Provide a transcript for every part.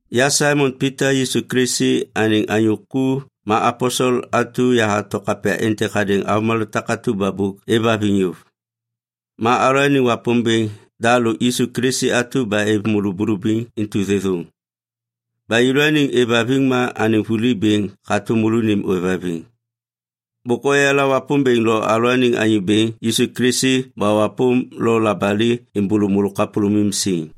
Ya Saimon Pita, Yisu Kilisi anêŋ anyô ku ma aposel atu yahato kapya êntêk hadêŋ avômalô takatu ba bôk êvhaviŋ yôv. Ma alalôaniŋ Wapômbêŋ da lôk Yisu Kilisi atu ba êv môlô bulubiŋ intu thêthôŋ. Ba yêlôaniŋ êvhaviŋ ma anêŋ vuli bêŋ hatôm môlônim ôêvhaviŋ. Bôk oyala Wapômbêŋ lo alalôaniŋ Anyô Bêŋ Yisu Kilisi ba wapôm lo labali êmbôlô môlô kapôlômim siŋ.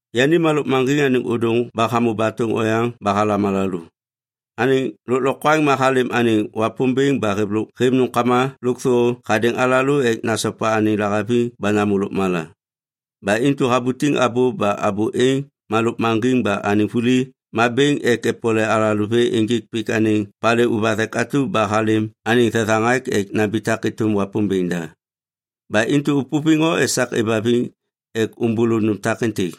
Yani ma lôkmaŋgiŋ anêŋ ôdôŋ ba hamô batôŋ oyaŋ ba halam alalô. Anêŋ lôklokwaŋ ma halêm anêŋ Wapômbêŋ ba hêv nômkama lôkthô hadêŋ alalô ek nasopa anêŋ lahaviŋ ba namô lôkmala. Ba intu habutiŋ abô ba abô êŋ ma lôkmaŋgiŋ ba anêŋ vuli ma bêŋ ek epole alalô vê ênjêk pik anêŋ palê ôvathek atu ba halêm anêŋ thethaŋak ek nambitak êtôm Wapômbêŋ da. Ba intu ôpôviŋ o esak êvhaviŋ ek ômbôlô nôm takêntêk,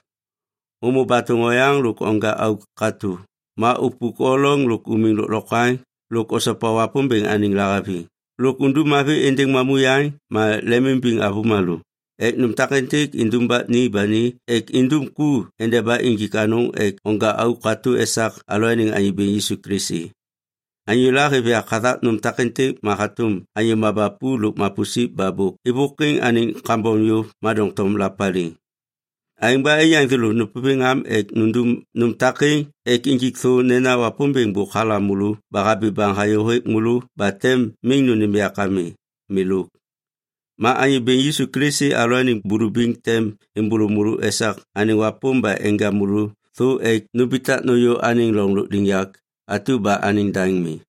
ômô batôŋ oyaŋ lôk onja auk katô ma upuk o loŋ lôk umiŋ lôklokwaŋ lôk osopa Wapômbêŋ anêŋ lahaviŋ lôk undum mavi êndêŋ mamuyaŋ ma lemimbiŋ avômalô ek nôm takêntêk indumbak ni ba ni ek indum ku endeba injik anôŋ ek onja auk katô esak alalôaniŋ Anyô Bêŋ Yisu Kilisi. Anyôla hêv yak hathak nôm takêntêk ma hatôm anyô mabapu lôk mapusip ba bôk êvôkwiŋ anêŋ kambom yôv ma doŋtom lapaliŋ. Aêŋ ba aiyaŋ thêlô nôpôviŋ am ek nundum nôm takêŋ ek injik thô nena Wapômbêŋ bôk halam môlô ba habi baŋ hayô hêk môlô ba tem miŋ nônêm yak ami. Milôk. Ma Anyô Bêŋ Yisu Kilisi alalôaniŋ bulubiŋ tem êmbôlô môlô esak anêŋ wapôm ba enja môlô thô ek numbitak nôyô anêŋ loŋ lôkliŋyak atu ba anêŋ daŋ mi.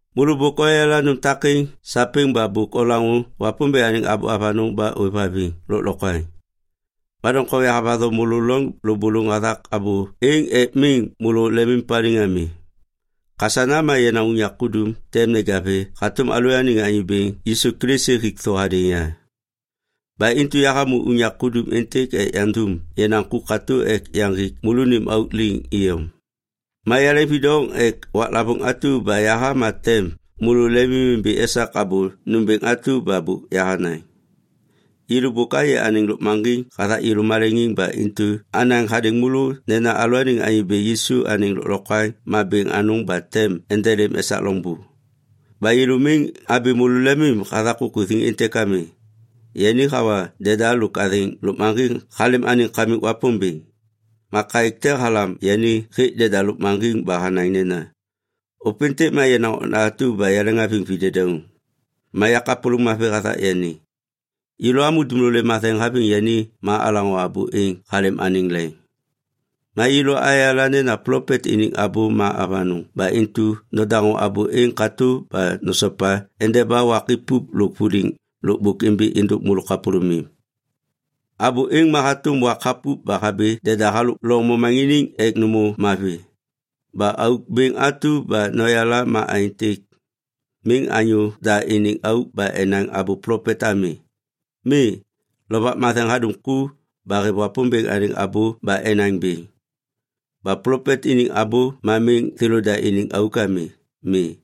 Môlô bôk oyala nôm takêŋ sapêŋ ba bôk olaŋô Wapômbêŋ anêŋ abô avanôŋ ba ôêv haviŋ lôklokwaŋ. Ma doŋtom yahavatho môlô loŋ lôbôlôŋ hathak abô êŋ ek miŋ môlô lemimpaliŋ ami. Kasana ma yenaŋ unyak kudum tem neja vê hatôm alalôaniŋ Anyô Bêŋ Yisu Kilisi hik thô hadêŋ ya. Ba intu yahamô unyak kudum êntêk ek yandum yenaŋ ku katô ek yaŋgik môlônim auk liŋ iyom. Ma yaleŋvidoŋ ek waklavôŋ atu ba yaha ma tem môlô lemimimbi esak abô nômbêŋ atu ba bôk yahanaŋ. Yêlô bôk ayê anêŋ lôkmaŋgiŋ hathak yêlô maleŋiŋ ba intu anaŋ hadêŋ môlô nena alalôaniŋ Anyô Bêŋ Yisu anêŋ lôklokwaŋ ma bêŋ anôŋ ba tem endelêm esak loŋbô. Ba yêlô miŋ abi môlô lemim hathak kukuthiŋ êntêk ami. Yani hawa deda lôk athêŋ lôkmaŋgiŋ halêm anêŋ Kamik Wapômbêŋ. Ma kaêk te halam yani hêk Deda Lôkmaŋgiŋ ba hanaŋ nena, “Ôpêntêk ma yenaŋ okna atu ba yaleŋhaviŋ videdauŋ. Ma ya kapôlôŋ mavi hathak yani.” Yêlô amô dumlolê matheŋ haviŋ yani ma alaŋô abô êŋ halêm anêŋ leŋ. Ma yêlô ayala nena plopet iniŋ abô ma avanôŋ ba intu nodaŋô abô êŋ katô ba nosopa endeba wak ipup lôk vuliŋ lôkbôk imbi êndôk môlô kapôlômim. Abô êŋ ma hatôm wak hapup ba habi deda halôk loŋ momaŋiniŋ ek nômô mavi. Ba auk bêŋ atu ba noyala ma aêntêk. Miŋ anyô da iniŋ auk ba enaŋ abô plopet ami. Mi. Lovak Matheŋ hadum ku ba hêv Wapômbêŋ anêŋ abô ba enaŋ bêŋ. Ba plopet iniŋ abô ma miŋ thêlôda iniŋ auk ami. Mi.